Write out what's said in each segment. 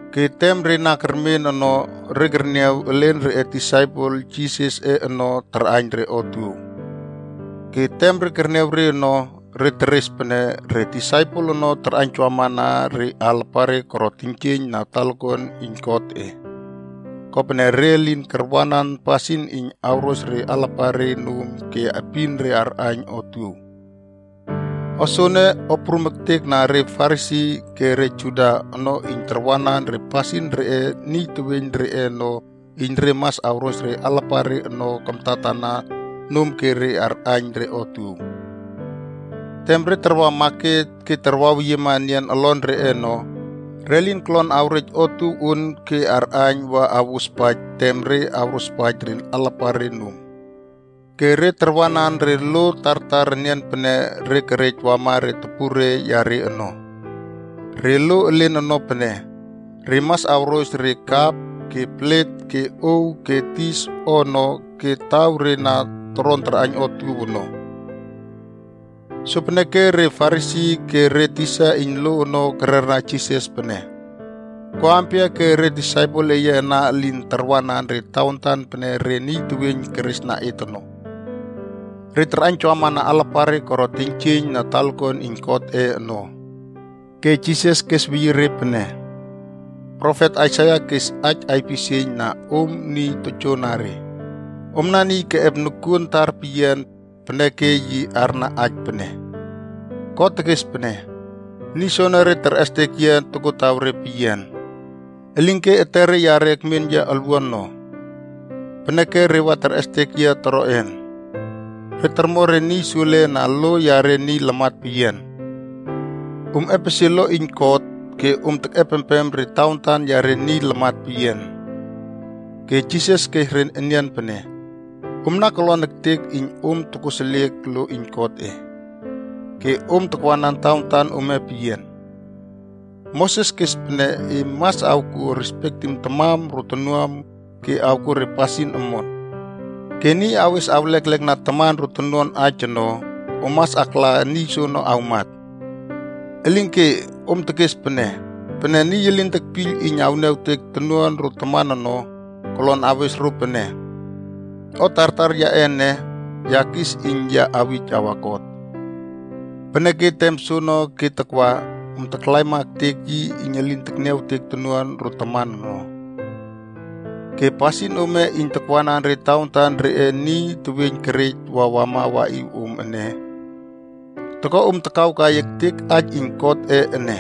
Ke tem re na kermen ono, re kerniaw elen reꞌe disaipel Jisasꞌe ono tarꞌaiyn re otuow. Ke tem re kerniaw re ono, re teres pene re disaipel ono tarꞌaiynjawamana re alapare koro teiynjieiyn na talakuan iyn Godꞌe. Kopene re lin karwanan pasin iyn awros re alapare nom ke epin re arꞌaiyn otuow. O soene, o prum ektek na re Farisi ke re Juda ono iyn tarwanan re pasin reꞌe niy teweiyn reꞌe ono iyn re mas awros re alapare ono kamtatana nom ke re arꞌaiyn re otuow. Tem re tarwa maket ke taraweyiema enian olon reꞌe ono, re lin kolon awrej otuow on ke arꞌaiyn wa awospaij tem re awrosapaij re alapare nom. Ke re tarwanan re lo tartar enian pene re kerej wama re topure yare ono. Re lo elen ono pene, re mas awros re kap ke plet ke ow ke dis o ono ke taw re na toron tarꞌaiyn otuow ono. Sopeneke re Farisi ke re tisa iyn lo ono kererna Jisas pene, “Ko ampia ke re disaipel eye ana elin tarwanan re tawantan pene re niy teweiyn kerꞌesna et ono? Re tarꞌaiynjawamana alapare koro teiynjieiyn na talakuan iyn Godꞌe ono.” Ke Jisas kesweyie re pene, “Profet Aisaia kes aij aipisieiyn na om niy tojoanare. Omna niy keꞌep noꞌuanom tarpeyian. Peneke yi arna aij pene, ‘God tekes pene, “Niy soenere terꞌestek yia tokotawre peyian, elinke etere yare ekmen yia olwuan no. Peneke re wa terꞌestek yia toroꞌen? Re tormo re niy sule na lo yare niy lamat peyian.” ’ “Om epesie lo iyn God, ke om tekꞌepempem re tawantan yare niy lamat peyian.” Ke Jisas kes re enian pene, “Omna kolon ektek iyn om tokoseliek lo iyn Godꞌe, ke om takwanan tawantan ome peyian. Moses kes pene ‘E mas akwo respektim tamam ro tonuam ke awko re pasin omon.’ Ke ‘Niy awes awleklekna taman ro tonuan aij ono, om mas akla niy soono awmat.’ Elinke, om tekes pene, ‘Pene niy elin tekpiyl iyn awniawtek tonuan ro taman ono, kolon awes ro pene, “O tartar yaꞌe ene, ya kis iyn ya awij awa God.a” ’ Peneke tem soono ke takwa, om taklaima ektek yi iyn elin tekniawtek tonuan ro taman ono. Ke pasin ome iyn takwanan re tawantan reꞌe niy teweiyn kerej wa wama waꞌiw om ene, toko om takawkai ektek aij iyn Godꞌe ene.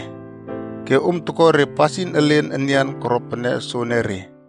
Ke om toko re pasin elen enian koro pene soenere.”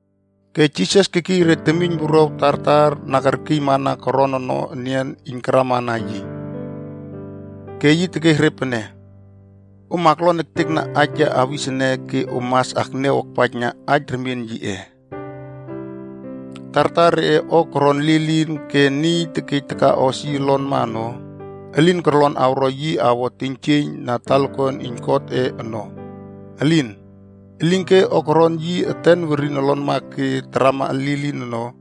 Ke Jisas kekiy re temiyn wuruaw tartar na kerkiymana koron ono enian iyn karamana yi, ke yi tekes re pene, “Om aklon ektekna aij ya awis ene ke om mas akniaw akpaijna aij remien yiꞌe. Tartar reꞌe o koron lilin ke niy tekej takaꞌos yi olonma ono, elin korlon awro yi awo teiynjieiyn na talakuan iyn Godꞌe ono. Elin. Elinke o koron yi eten werin olonma ke tarama lilin ono,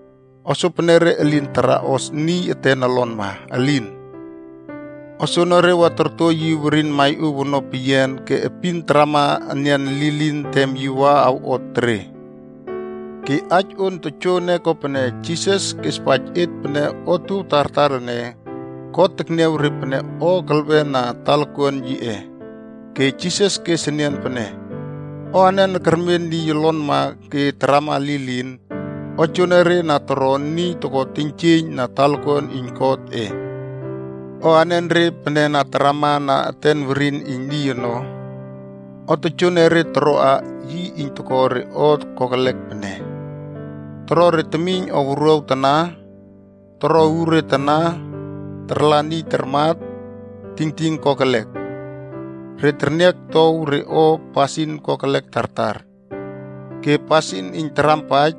O sopenere elin taraꞌos niy eten olonma, elin. O soenere wa torto yi werin maiꞌow ono peyian ke epin tarama enian lilin tem yi wa awꞌot tere.” Ke aij on tojoene kopene Jisas kespaij et pene otuow tartar ene, God tekniaw re pene o kelwen na talakuan yiꞌe. Ke Jisas kes enian pene, “O anen kermen niy olonma ke tarama lilin, o joenere na toro niy toko teiynjieiyn na talakuan iyn Godꞌe. O anenre pene na tarama na eten werin iyn niy ono, o tojoenere toroa yi iyn toko re o kokelek pene: toro re temiyn o wuruaw tana, toro uure tana, tarla niy tarmat, tingting kokelek, re terniaktow re o, pasin kokelek tartar, ke pasin iyn tarampaij,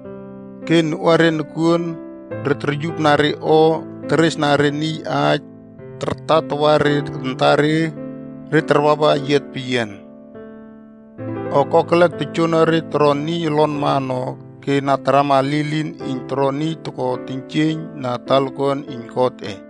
ke noꞌuare nokuon, re toryupna re o, teres na re niy aij, tartawa re antare, re tarwawa eyiat peyian. “O kokelek tojoenere toron niy olonma ono ke na tarama lilin iyn toro niy toko teiynjieiyn na talakuan iyn Godꞌe.”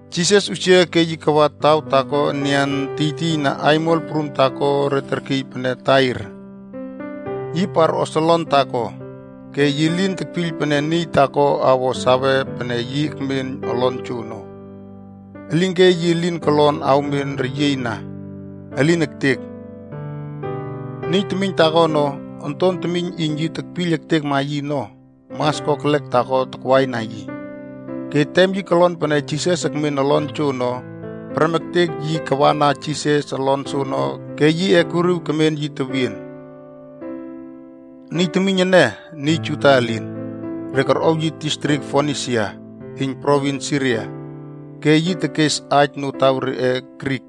Jisas usia ke yi kawa taw taako enian tiytiy na aimol prum taako re terkiy pene Tair. Yi parꞌos olon taako, ke yi lin tekpiyl pene niy taako awo sawe pene yi ekmen olon joono. Elinke yi lin kolon awmen reyieiyna, elin ektek. Niy temiyn taako ono, onton temiyn iyn yi tekpiyl ektekma yi ono, mas kokelek taako takwaina yi. Ke tem yi kolon pene Jisas ekmen olon joono, prem ektek yi kawana Jisas olon soono ke yi ekuriw kemen yi tewien. Niy temiyn ene, niy Juda elin. Re korꞌow yi distrik Fonisia iyn provins Siria. Ke yi tekes aij notaw reꞌe “Grik”.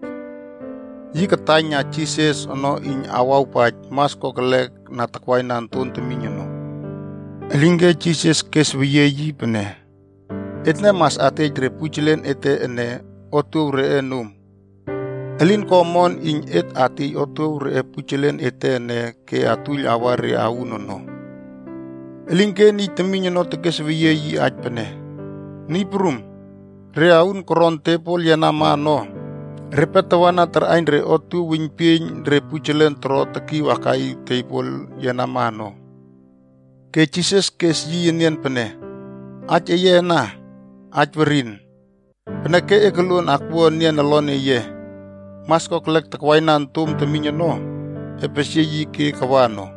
Yi kataiyna Jisas ono iyn awawpaij mas kokelek na takwaina onton temiyn ono. Elinke Jisas kesweyie yi pene, “Etne mas atej re pujelen ete ene otuow reꞌe nom. Elin ko omon iyn et atiey otuow reꞌe pujelen ete ene ke atuiyl awa re aund ono.” Elinke niy temiyn ono kesweyie yi aij pene, “Niy Prum, re aun koron tebol yenama ono, repe tawana tarꞌaiyn re otuow weiynpieiyn re pujelen toro tekiw akaꞌiw tebol yenama ono.” Ke Jisas kes yi enian pene, “Aij eye ana, aij werin. Peneke e koluon akwua enian olon eye. Mas kokelek takwaina ontom temiyn ono, epesie yi ke kawa ono.”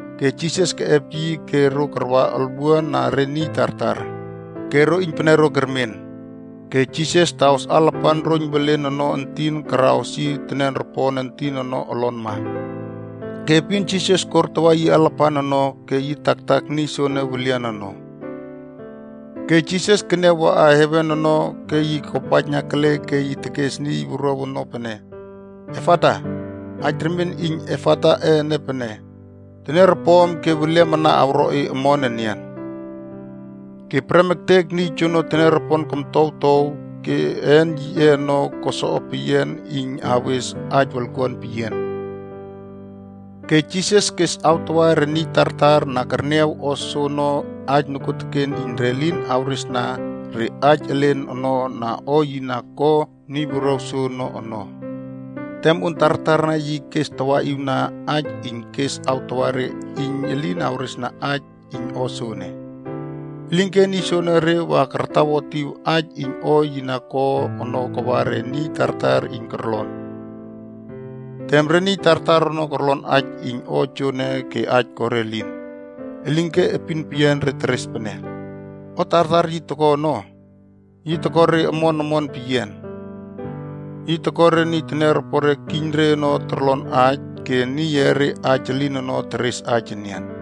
Ke Jisas keꞌep yi ke ro karwa olwuan na re niy tartar, ke ro iynpenero kermen. Ke Jisas taꞌos alapan roiyn welen ono entin karaꞌos yi teniaropon entin ono olonma. Ke epin Jisas kortawa yi alapan ono ke yi taktak niy soene welian ono. Ke Jisas keniaw waꞌa heven ono ke yi kopaijna kele ke yi tekes niy wuruaw ono pene, “Efata.” Aij remien iyn “Efata” ene pene “Teniaropom ke weliam ana awro e omon enian.” Ke prem ektek niy joene teniaropon komtowtow ke een yiꞌe ono ko soꞌopeyian iyn awes aij wolkuan peyian. Ke Jisas kes awtawa re niy tartar na kerniaw o soono aij nokuoteken iyn re lin awresna re niy elen ono na o yi na ko niy wuruaw soono ono. Tem on tartarna yi kestawaꞌiwna aij iyn kes awtawa re iyn elin awresna aij iyn o soene. Elinke niy soonore wa kartawotiw aij iyn o yi na ko ono kawa re niy tartar iyn korlon. Tem re niy tartar ono korlon aij iyn o joene ke aij ko re elin. Elinke epin peyian re teres pene, “O tartar yi toko ono, yi toko re omon omon peyian. Yi toko re niy teniaropore kiyn re ono torlon aij ke niy eere aij elin ono teres aij enian.”